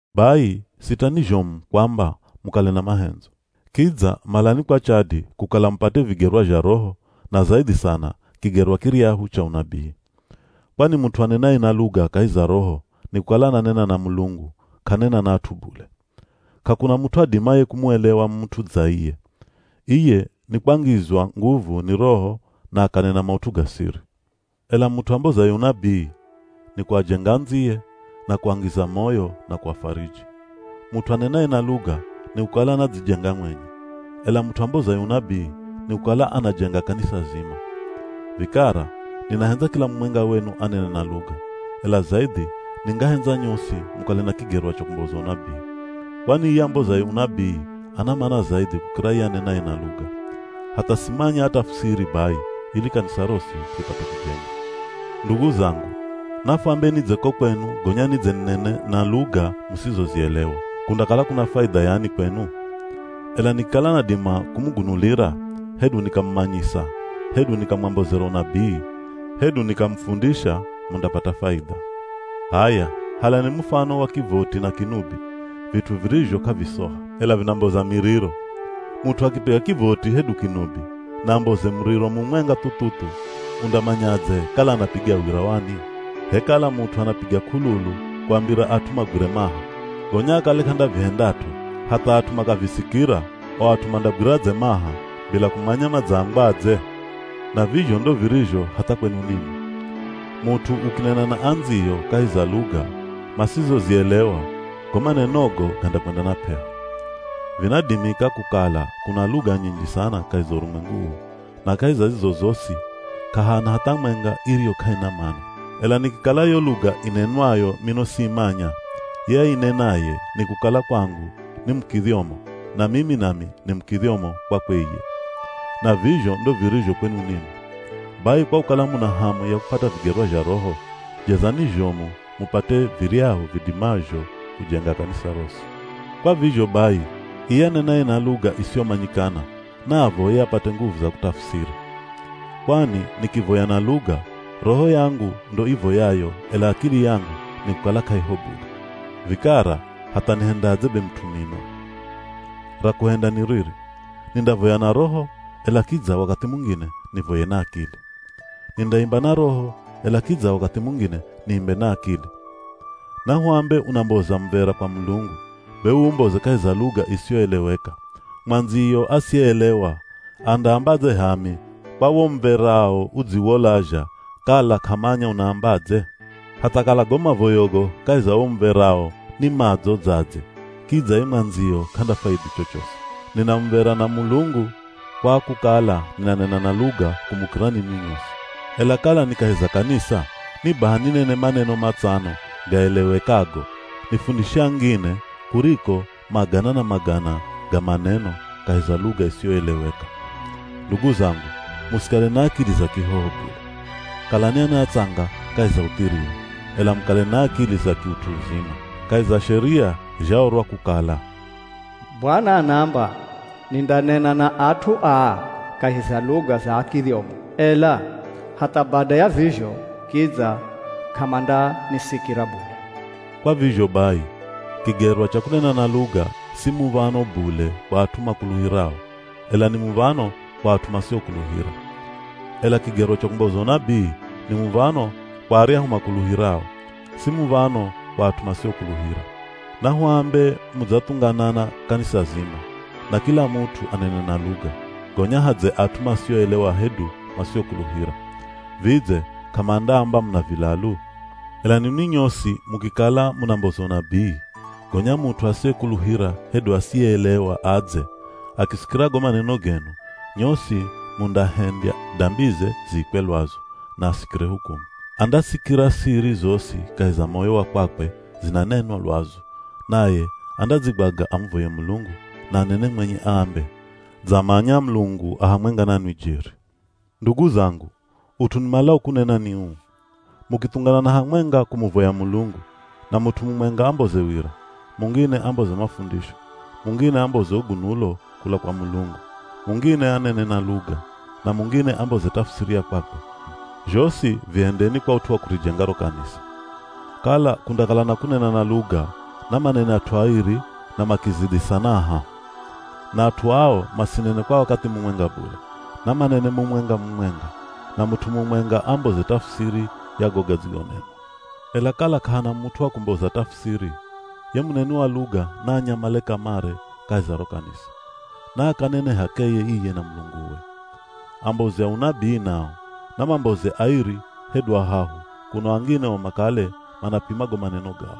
Bai, sitani zhomu kwamba mukale na mahendzo. Kidza malani kwa chadi kukala mupate vigerwa zha Roho, na zaidhi sana kigerwa kiryahu cha unabii. Kwani mut'u anenaye na luga kahi za Roho nikukala ananena na Mulungu k'anena na at'u bule. K'akuna mut'u adimaye kumuelewa mut'u dza iye. Iye nikwangizwa nguvu ni Roho na akanena maut'u ga siri. Ela mut'u ambozaye unabii, nikuajenga andziye, na kuangiza moyo na kuafariji. Mut'u anenaye na luga nikukala anadzijenga mwenye, ela mut'u ambozaye unabii nikukala anajenga kanisa zima. Vikara, ninahendza kila mumwenga wenu anene na luga, ela zaidhi ningahendza nyosi mukale na kigerwa cha kumboza unabii. Kwani iye ambozaye unabii ana mana zaidhi kukira ye anenaye na luga. Hatha simanya atafusiri bai ili kanisa rosi ripate kujengwa. Ndugu zangu, nafuambe nidze ko kwenu gonya nidze ninene na luga musizozielewa, kundakala kuna faidha yani kwenu? Ela nikikala nadima kumugunulira, hedu nikamumanyisa, hedu nikamwambozera unabii, hedu nikamufundisha mundapata faidha. H'aya halani mufano wa kivoti na kinubi, vit'u virizho k'avisoha, ela vinamboza miriro. Mut'u akipiga kivoti hedu kinubi, na amboze muriro mumwenga thuthuthu, undamanyadze kala anapiga wira wani? H'e kala mut'u anapiga k'ululu kuambira at'u magwire maha, gonya akale k'andavihendat'o hatha at'u makavisikira, o at'u mandagwiradze maha bila kumanya madzaambwadze? Na vizho ndo virizho hatha kwenu ninwi. Mut'u ukinena na andziyo kahi za luga masizozielewa, go manenogo gandakwenda na p'eho. Vinadimika kukala kuna luga nyinji sana kahi za urumwengu uu, na kahi za zizo zosi k'ahana hatha mwenga iriyo k'aina mana. Ela nikikala yo luga inenwayo mino siimanya, ye ainenaye nikukala kwangu ni mukidhyomo, na mimi nami ni mukidhyomo kwakwe iye. Na vizho ndo virizho kwenu ninwi. Bai, kwa kukala muna hamu ya kupata vigerwa zha Roho, jezani zhomu mupate viryahu vidimazho kujenga kanisa rosi. Kwa vizho bai, iye anenaye na luga isiyomanyikana, naavoye apate nguvu za kutafusiri. Kwani nikivoya na luga, roho yangu ndo ivoyayo ela akili yangu nikukala k'aiho bule. Vikara hatha nihendadze be mut'u mino! Ra kuhenda ni riri: nindavoya na roho, ela kidza wakathi mungine nivoye na akili. Nindaimba na roho, ela kidza wakathi mungine niimbe na akili. Nahuambe unamboza muv̱era kwa Mulungu, be uumboze kahi za luga isiyoeleweka, mwandziyo asiyeelewa, andaambadze “H'aami!” kwa wo muv̱erao udziwolazha kala k'amanya unaambadze? Hatha kala go mavoyogo kahi za wo muv̱era ni madzo dza dze kidza ye mwandziyo k'andafaidhi chochosi. Nina muv̱era na Mulungu kwa kukala ninanena na luga kumukira ninwi nyosi. Ela kala ni kahi za kanisa, ni baha ninene maneno matsano gaelewekago, nifundishe angine, kuriko magana na magana ga maneno kahi za luga isiyoeleweka. Ndugu zangu, musikale na akili za kihoho bule. Kalani ana atsanga kahi za uthiriri, ela mukale na akili za kiut'u uzima. Kahi za sheria zhaorwa kukala, “Bwana anaamba, nindanena na at'u aa kahi za luga za akidhyomo, ela hatha bada ya vizho kidza k'amandanisikira bule.” Kwa vizho bai, kigerwa cha kunena na luga si muv̱ano bule kwa at'u makuluhirao, ela ni muv̱ano kwa at'u masiokuluhira. Ela kigerwa cha kumboza unabii ni muv̱ano kwa aryahu makuluhirao, si muv̱ano kwa at'u masiokuluhira. Nahuambe mudzathunganana kanisa zima, na kila mut'u anene na luga, gonya hadze at'u masioelewa hedu masiokuluhira. Vidze, k'amandaamba muna vilalu? Ela ninwi nyosi mukikala munamboza unabii, gonya mut'u asiyekuluhira hedu asiyeelewa adze, akisikira go maneno genu, nyosi mundahendya dambize ziikwe lwazu, na asikire hukumu. Andasikira siri zosi kahi za moyo wa kwakwe zinanenwa lwazu, naye andadzigwaga amuvoye Mulungu na anene mwenye aambe, “Dzamanya Mulungu a hamwenga nanwi jeri.” Ndugu zangu, ut'u nimalao kunena ni uu: Mukithunganana hamwenga kumuvoya Mulungu, na mut'u mumwenga amboze wira, mungine amboze mafundisho, mungine amboze ugunulo kula kwa Mulungu, mungine anene na luga, na mungine amboze tafusiri ya kwakwe, zhosi vihendeni kwa ut'u wa kurijenga ro kanisa. Kala kundakala na kunena na luga, namanene at'u airi na makizidhi sana ahahu. Na at'u ao masinene kwa wakathi mumwenga bule, namanene mumwenga-mumwenga, na mut'u mumwenga amboze tafusiri ya go gadzigonenwa. Ela kala k'ahana mut'u wa kumboza tafusiri, ye muneni wa luga naanyamale kamare kahi za ro kanisa, naakanene h'akeye iye na Mulunguwe. Ambozi a unabii nao, namamboze airi hedu ahahu kuno angine o makale manapima go maneno gao.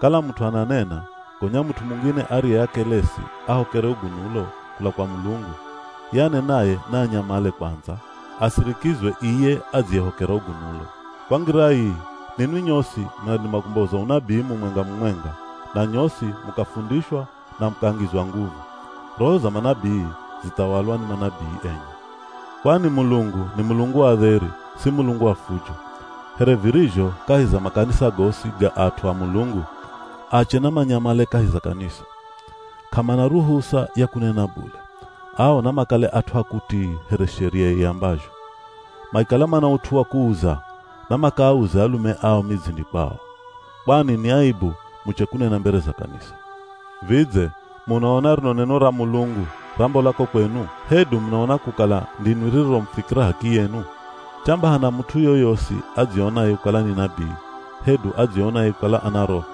Kala mut'u ananena gonya mut'u mungine ariye akelesi ahokere ugunulo kula kwa Mulungu, ye anenaye naanyamale kwandza asirikizwe iye adziyehokera ugunulo. Kwa ngira ii, ninwi nyosi munadima kumboza unabii mumwenga-mumwenga, na nyosi mukafundishwa na mukangizwa nguvu. Roho za manabii zithawalwa ni manabii enye, kwani Mulungu ni Mulungu wa dheri, si Mulungu wa fujo. Here virizho kahi za makanisa gosi ga at'u a Mulungu, ache namanyamale kahi za kanisa. K'amana ruhusa ya kunena bule, ao namakale at'u a kutii here sheria iambazho. Makikala mana ut'u wa kuuza, namakaauze alume ao midzini kwao. Kwani ni aibu muche kunena mbere za kanisa. Vidze, munaona rino neno ra Mulungu rambola ko kwenu? Hedu munaona kukala ndinwi ririromufikira h'akiyenu? Chamba hana mut'u yoyosi adzionaye kukala ni nabii, hedu adzionaye kukala ana Roho,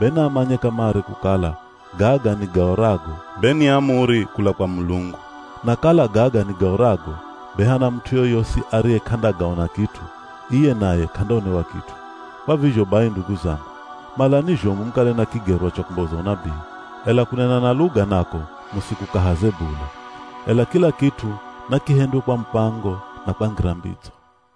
be naamanye kamare kukala gaga nigaorago be ni amuri kula kwa Mulungu. Na kala gaga nigaorago be hana mut'u yoyosi ariye k'andagaona kit'u, iye naye k'andaonewa kit'u. Kwa vizho bai ndugu zangu, malani zhomu mukale na kigerwa cha kumboza unabii, ela kunena na luga nako musikukahaze bule. Ela kila kit'u nakihendwe kwa mupango na kwa ngira mbidzo.